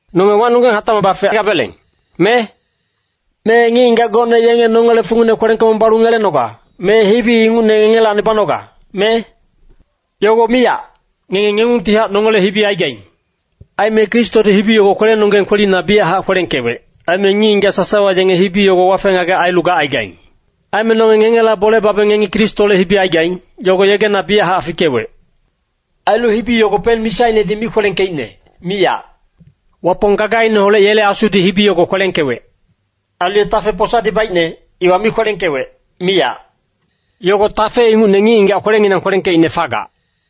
Nonge wacnonggeng hatacmac bafegabeleng, me? Me ngic-ngigac gocne yenge nongele fungine kwelengkebong balu ngelenoga, me hibi ingucne ngengelacni banoga, me? Yogo miyac! Ngenge ngengungtihac nongele hibi aigaing. Aime Kristodi hibi yogo kwelenonggeng kwelina biyachac kwelengkewec. Aime ngic-ngigac sasawa yenge hibi yogo wafe-ngagec ailu gacaigaing. Aime nonge ngengela bole babeng ngengi Kristole hibi aigaing, yogo yegena biyachac fikewec. Ailu hibi yogo pen-misainedi mi kwelengkeicne, miyac. Wapong gagaineholec yele Asudi hibi yogo kwelengkewec. Ailu ye tafe posadi baicne, iwa mi kwelengkewec, miyac. Yogo tafe ingucne ngic-ngigac kwelenginang kwelengkeicne fagac.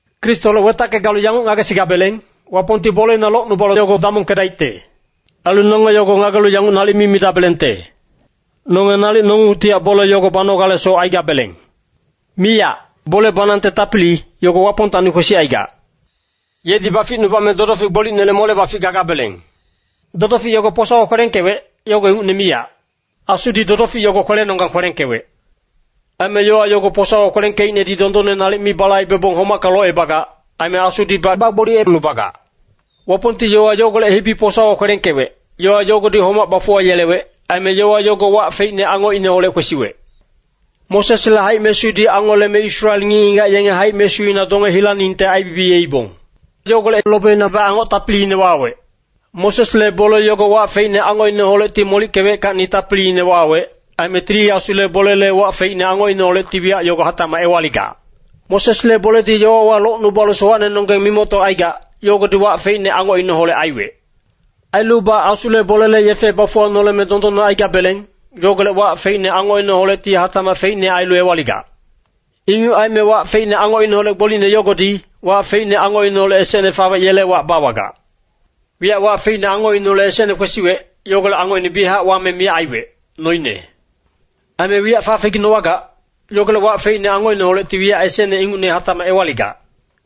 Kristoholec wetacke galu yanguc ngagesigabeleng, Wapongti boleina locnubalu yogo damongkedaicte. Ailu nonge yogo ngagelu yanguc nalic mi midabelengte, “Nonge nalic nongungtihac bole yogo banogalesoc aigabeleng.” Miyac. Bole banangte tapili, yogo Wapongtacni kwesicaigac. Yedi baficnubame dodofic gbolicnele mole-bafic gagabeleng. Dodofic yogo posawa kwelengkewec, yogo ingucne miyac. Asudi dodofic yogo kwelenonggang kwelengkewec. Aime yowa yogo posawa kwelengkeicnedi dondonne nalic mi balaibebong homacka locebagac. Aime Asudibac bagboliyecnubagac. Wapongti yowa yogolec hibi posawa kwelengkewec, yowa yogodi homac bafuwayelewec. Aime yowa yogo wac feicne angocineholec kwesiwec. Mosesle haic-mesudi angoleme Israel ngic-ngigac yenge haic-mesuina donge hilaningte aibibiyeibong. Yogolec lobeinabac angoc tapiliine wawec. Mosesle bole yogo wac feicne angocineholecti molickeweckacni tapiliine wawec. Aime Tili Asule bolele wac feicne angocineholecti wiyac yogo hatacmac ewaligac. Mosesle boledi yowawa locnubalu sowacnenonggeng mimoctocaigac, yogodi wac feicne angocineholec aiwec. Ailubac Asule bolele yefe bafuwanoleme dondonne aigabeleng, yogolec wac feicne angocineholecti hatacmac feicnehac ailu ewaligac. Inguc aime wac feicne angocineholec gbolicne yogodi, wac feicne angocineholec esecne fawec yele wac bawagac. Wiyac wac feicne angocineholec esecne kwesiwec, yogolec angocine biyachac wame miyac aiwec, noine. Aime wiyac fafeginowagac, yogolec wac feicne angocineholecti wiyac esecne ingucne hatacmac ewaligac.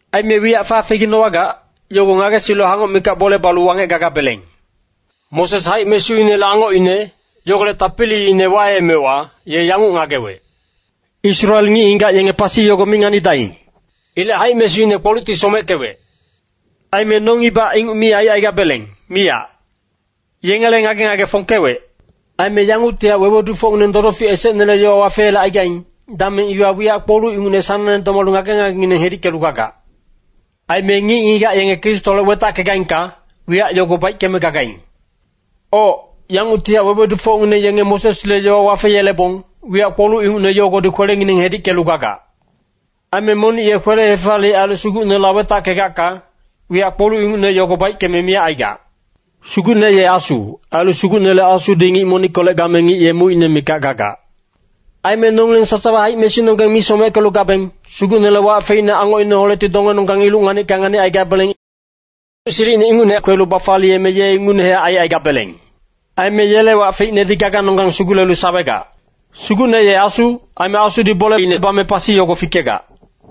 Aime wiyac fafeginowagac, yogo ngagesilu hangoc mikac bole balu wangec gagabeleng. Moses haic-mesuinele angocine, yogolec tapiliine waemewa, ye yanguc ngagewec, “Israel ngic-ngigac yenge pasi yogo mi nganidaing.” Ilec haic-mesuine kpolucti someckewec. Aime nongibac inguc mi aicaigabeleng, miyac. Yengele ngage-ngage fongkewec. Aime yanguctihac wewedufocngineng dodofic esecnele yowa wafeyelecaigaing, dameng iwa wiyac kpoluc ingucne sanangne domalu ngage-ngagengineng hedickelu gagac. Aime ngic-ngigac yenge Kristoholec wetackegaingka, wiyac yogo baickeme gagaing. Oc, yanguctihac wewedufocngineng yenge Mosesle yowa wafeyelebong, wiyac kpoluc ingucne yogodi kwelengineng hedickelu gagac. Aime monic ye kwele-hefaliyec ailu Sugucneholec wetackegacka, wiyac kpoluc ingucne yogo baickeme miyac aigac. Sugucne ye Asu, ailu Sugucnele Asudi ngic monickolec game ngic ye mucine mikac gagac. Aime nongileng sasawa haic-mesunonggeng mi someckelu gabeng, Sugucnele wac feicne angocineholecti dongenonggang iluc nganicka nganicaigabeleng. Silicine ingucne kwelu bafaliyeme ye ingucnehac aicaigabeleng. Aime yele wac feicnedi gaganonggang sugulelu sawegac. Sugucne ye Asu, aime Asudi boleine bame pasi yogo fikegac.